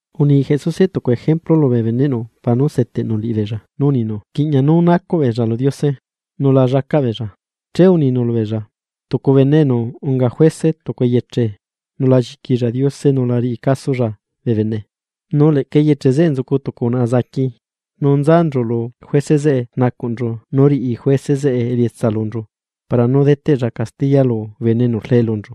Uni Jesuse tucu ejemplu lubee beneꞌnu para nú seteꞌnu liꞌibeella nu uninu rquiꞌña nú nacuꞌ beella lu Diose, nu la llacaꞌ beella. Che uninu nú lu beella: ―Tucu bene enu unga juece tucu eyeche nu la lliquilla Diose nu la riꞌi casolla bee bene. Nu leꞌca eyeche zeꞌe nzucu tucu unaꞌa enu unguti niyuꞌ, nu nzanchu lu juece zeꞌe rnacuꞌnchu nú riꞌi juece zeꞌe elietsa lunchu para nú deteꞌlla castiya lu bene enu rlee lunchu.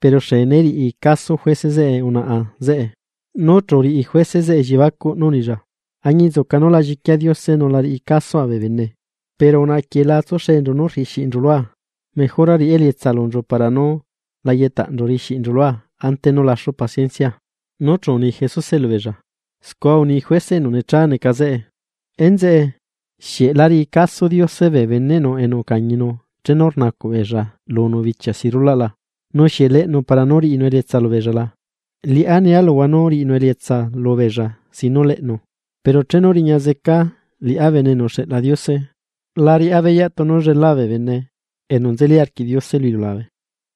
Pero xee né riꞌi caso juece zeꞌe unaꞌa zeꞌe, nu chu uriꞌi juece zeꞌe elliebacuꞌ nú unilla: “Añinzuca nú la lliquia Diose nu la riꞌi casoa bee bene, pero unaꞌa quieꞌ la tsuxenchu nú rriꞌi xiꞌinchu lua, mejora riꞌá elietsa lunchu para nú la yeꞌtaꞌnchu ante nú laxu paciencia.” Nu chu uni Jesuse lubeella: ―Scua uni juece enu necha neca zeꞌe. Enzeꞌe, ¿xieꞌ la riꞌi caso Diose bee beneꞌnu enu ucañinu chenu rnacuꞌ beella lunu bichia si rulaꞌ la? Nu, ¿xieꞌ leꞌnu para nú riꞌinu elietsa lubeella la? Liꞌá nia luhua nú riꞌinu elietsa lubeella sin nú leꞌnu. Pero chenu riña zeca liꞌá Bene enu uxeꞌla Diose, la riꞌá beyaꞌ tunu llelá bee bene enu nzeli arquiꞌ Diose lu iliulabe.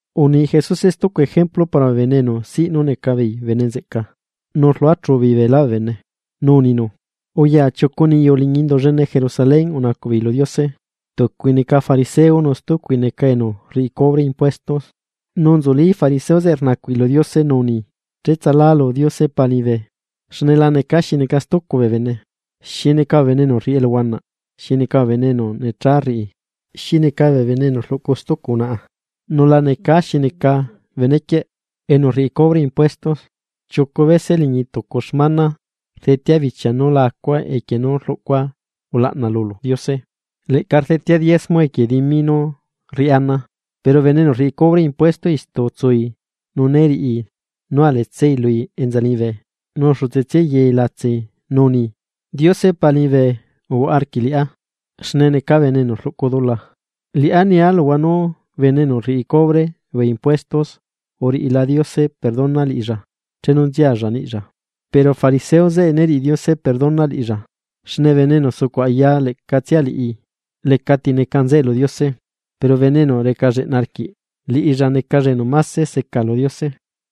Uni Jesuse stucu ejemplu para bee bene enu siꞌ nú neca beei bene nzeꞌca, nu rluachu beei beelá bee bene, nu uninu: ―Uya chiucu niyu liñi Indu llene Jerusalén unacuꞌ beei lu Diose: tucui neca fariseo, nu stucui neca enu rriꞌi cubre impuestos. Nu nzulí fariseo zeꞌe rnacuꞌi lu Diose nú uni: “Cheꞌtsalu Diose Pa liñibe, xne la necaa xi neca stucu bee bene, xi neca bee bene enu rriꞌi eluhuanaꞌ, xi neca bee bene enu necha rriꞌi, xi neca bee bene enu rluꞌcu stucu unaꞌa, nu la necaa niꞌ xi neca benequieꞌ enu rriꞌi cubre impuesto. Chiucu bese liñi tucu xmana rdetea bichia nú la acua equie nú rluꞌcua ulaꞌna lulu Diose, leꞌca rdetea diezmo equie dimi nú rriꞌá ana.” Pero bene enu rriꞌi cubre impuesto istu utsui nu né riꞌi nú aletsai lui enza liñibe, nu xutse tsiai yai latsai nu uni: “¡Diose Pa liñibe uhuaꞌa arquiꞌ liꞌá, xne neca bene enu rluꞌcu dula!” Liꞌá nia luhua nú bene enu rriꞌi cubre bee impuesto uriꞌila Diose perdona liꞌilla chenu nzialla niꞌlla, pero fariseo zeꞌe né riꞌi Diose perdona liꞌilla, xne bene enu sucuꞌ aya leꞌcatsia liꞌi lecati neca nzeꞌe lu Diose. Pero bene enu reca lleꞌna arquiꞌ, liꞌilla necalla enu máse seca lu Diose.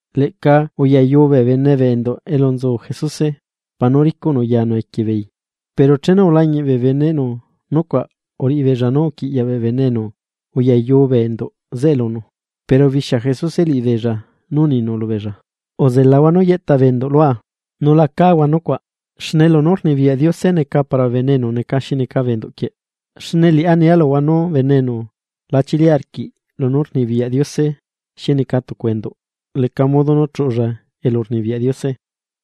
Leꞌca uyayu bee bene bee enduꞌ elu nzu Jesuse para nú ricuꞌnu yanu equie beei. Pero chenu ulañiꞌ bee beneꞌnu nucuaꞌ, uriꞌi beella nú uquiꞌyaꞌ bee bene enu uyayu bee enduꞌ zeꞌe lunu. Pero ubixia Jesuse liꞌibeella nu uninu lubeella: ―Uzelahua nú yeꞌta bee enduꞌ lua nu la cáhua nucuaꞌ, xne lunú rnibiyaꞌ Diose neca para bee bene enu neca xi neca bee enduꞌ quieꞌ. Xne liꞌá nia luhua nú bene enu la chili arquiꞌ lunú rnibiyaꞌ Diose xi neca tucu enduꞌ, leca modo nú chuꞌulla elurnibiyaꞌ Diose.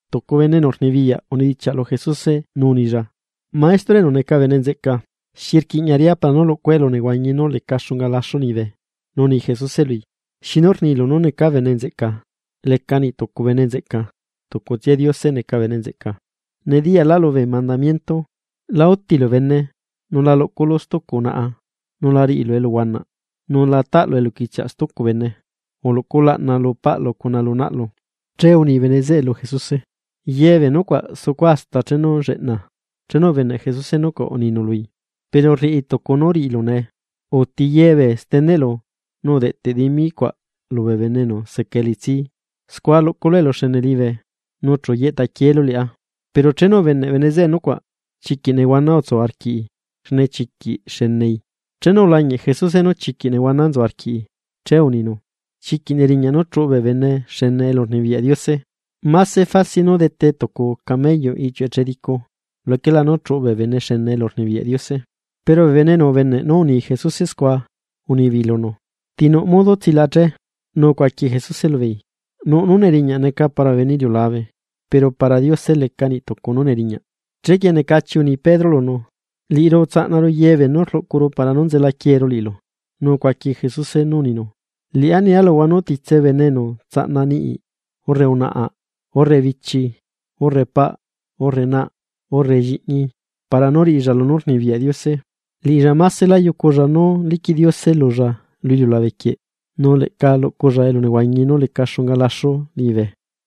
Tucu bene enu rnibiyaꞌ unidichiaꞌ lu Jesuse nú unilla: ―Maestro, enu neca bene nzeꞌca, ¿xi rquiꞌña riꞌá para nú lucua elunehuañi nú leca xunga laxu liñibe? Nu uni Jesuse lui: ―¿Xinu rnilu nú neca bene nzeꞌca? Leca niꞌ tucu bene nzeꞌca, tucutsia Diose neca bene nzeꞌca. Nediyaꞌláꞌlu bee mandamiento: “La útilu bene, nu la luꞌculu stucu unaꞌa, nu la riꞌilu eluhuanaꞌ, nu la taꞌlu eluquichiaꞌ stucu bene, uluꞌcu ulaꞌna lu paꞌlu cuna lu naꞌlu.” Che uni bene zeꞌe lu Jesuse: ―Ye bee nucuaꞌ sucua hasta chenu lleꞌna. Chenu ubeneꞌ Jesuse nucuaꞌ, uninu lui: ―Pero rriꞌi tucu nú riꞌilu nee. Uti ye bee steneꞌlu, nu udeꞌteꞌ dimi cuaꞌ lubee bene enu seca elitsi. Scua luꞌculu eluxene liñibe. Nu chu yeꞌta quieelu liꞌá. Pero chenu ubeneꞌ bene zeꞌe nucuaꞌ, chiquiꞌ nehuana utsuu arquiꞌi, xne chiquiꞌ xenei. Chenu ulañiꞌ Jesuse nú chiquiꞌ nehuana nzu arquiꞌi, che uninu: ―¡Chiquiꞌ neriñaꞌ nú chuꞌu bee bene xene elurnibiyaꞌ Diose! Máse facil nú dete tucu camello iꞌchiuꞌ echedicu, luquela nú chuꞌu bee bene xene elurnibiyaꞌ Diose. Pero bee bene enu ubeneꞌ nú uni Jesuse scua, unibeei lunu: ―¿Ti nuꞌ modo tsilaꞌa che? Nu ucuaqui Jesuse lubeei: ―Nuꞌ nú neriñaꞌ neca para bee bene iliulabe, pero para Diose leca niꞌ tucu nú neriñaꞌ. Chequie necachi uni Pedro lunu: ―Liꞌiru utsaꞌnaru ye beenú rluꞌcuru para nú nzela quieeru liꞌilu. Nu ucuaqui Jesuse nú uninu: ―Liꞌá nia luhua nú titse bene enu tsaꞌna niꞌi, urre unaꞌa, urre bichi, urre paꞌ, urre na, urre lliꞌñi, para nú riꞌilla lunú rnibiyaꞌ Diose, liꞌilla másela yuculla nú liquiꞌ Diose lulla lu iliulabe quieꞌ nu leꞌca luculla elunehuañi nú leca xunga laxu liñibe.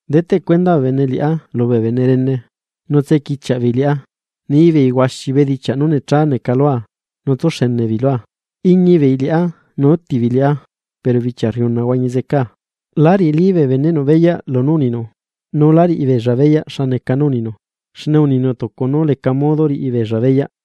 Deteꞌ cuenda bee bene liꞌá lubee bene rene, nu tsequichiaꞌ beei liꞌá, ni beei huaxi bedichiaꞌ nú necha neca lua nu tsúxene beei lua. Iñi beei liꞌá nu úti beei liꞌá, pero bichia rriuna huañi zecaa. La riꞌilí bee beneꞌnu beyaꞌ lunú uninu, nu la riꞌi beella beyaꞌ xa neca nú rninu, xne uninu tucu nú leca modo riꞌi beella beyaꞌ.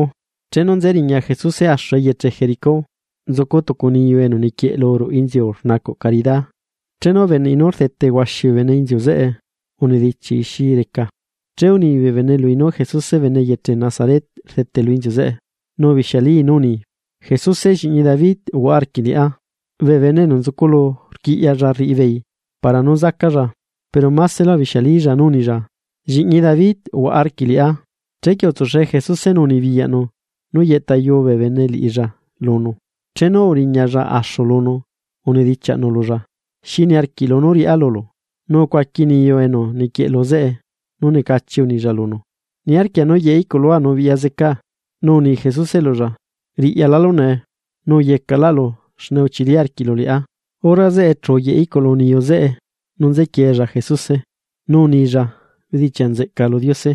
Chenu nze riña Jesuse axu eyeche Jericó, nzucu tucu niyu enu niquieꞌlu ruꞌu inziu rnacuꞌ carida, chenu ubeneꞌi nú rdete huaxi bee bene inziu zeꞌe unidichiaꞌi xi reca. Che uni bee bene lui nú Jesuse bene eyeche Nazaret rdete lu inziu zeꞌe, nu ubixialí nú uni: ―¡Jesuse lliꞌñi David uhuaꞌa arquiꞌ liꞌá! Bee bene enu nzuculu rquiꞌyalla rriꞌi beei para nú zacalla, pero másela ubixialilla nú unilla: ―¡Lliꞌñi David uhuaꞌa arquiꞌ liꞌá! Chequie utsuxee Jesuse nu unibiyaꞌnu nú yeꞌtayuu bee bene liꞌilla lunu. Chenu uriñalla axu lunu unidichiaꞌnu lulla: ―¿Xi niarquiꞌlu nú riꞌá lulu? Nu ucuaqui niyu enu niquieꞌlu zeꞌe nu necachi unilla lunu: ―Niarquia nú yeꞌe iꞌculua nu biꞌya zecaa. Nu uni Jesuse lulla: ―Riꞌyalálu nee, nu uyecaꞌlaꞌlu xne uchili arquiꞌlu liꞌá. Hora zeꞌe chu uyeꞌe iꞌculu niyu zeꞌe, nu nzequiei Jesuse nu uni bedichiaꞌ nzeꞌca lu Diose.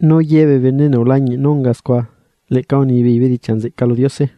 Nu ye bee bene enu ulañiꞌ nú unga scua, leꞌca unibeei bedichiaꞌ nzeꞌca lu Diose.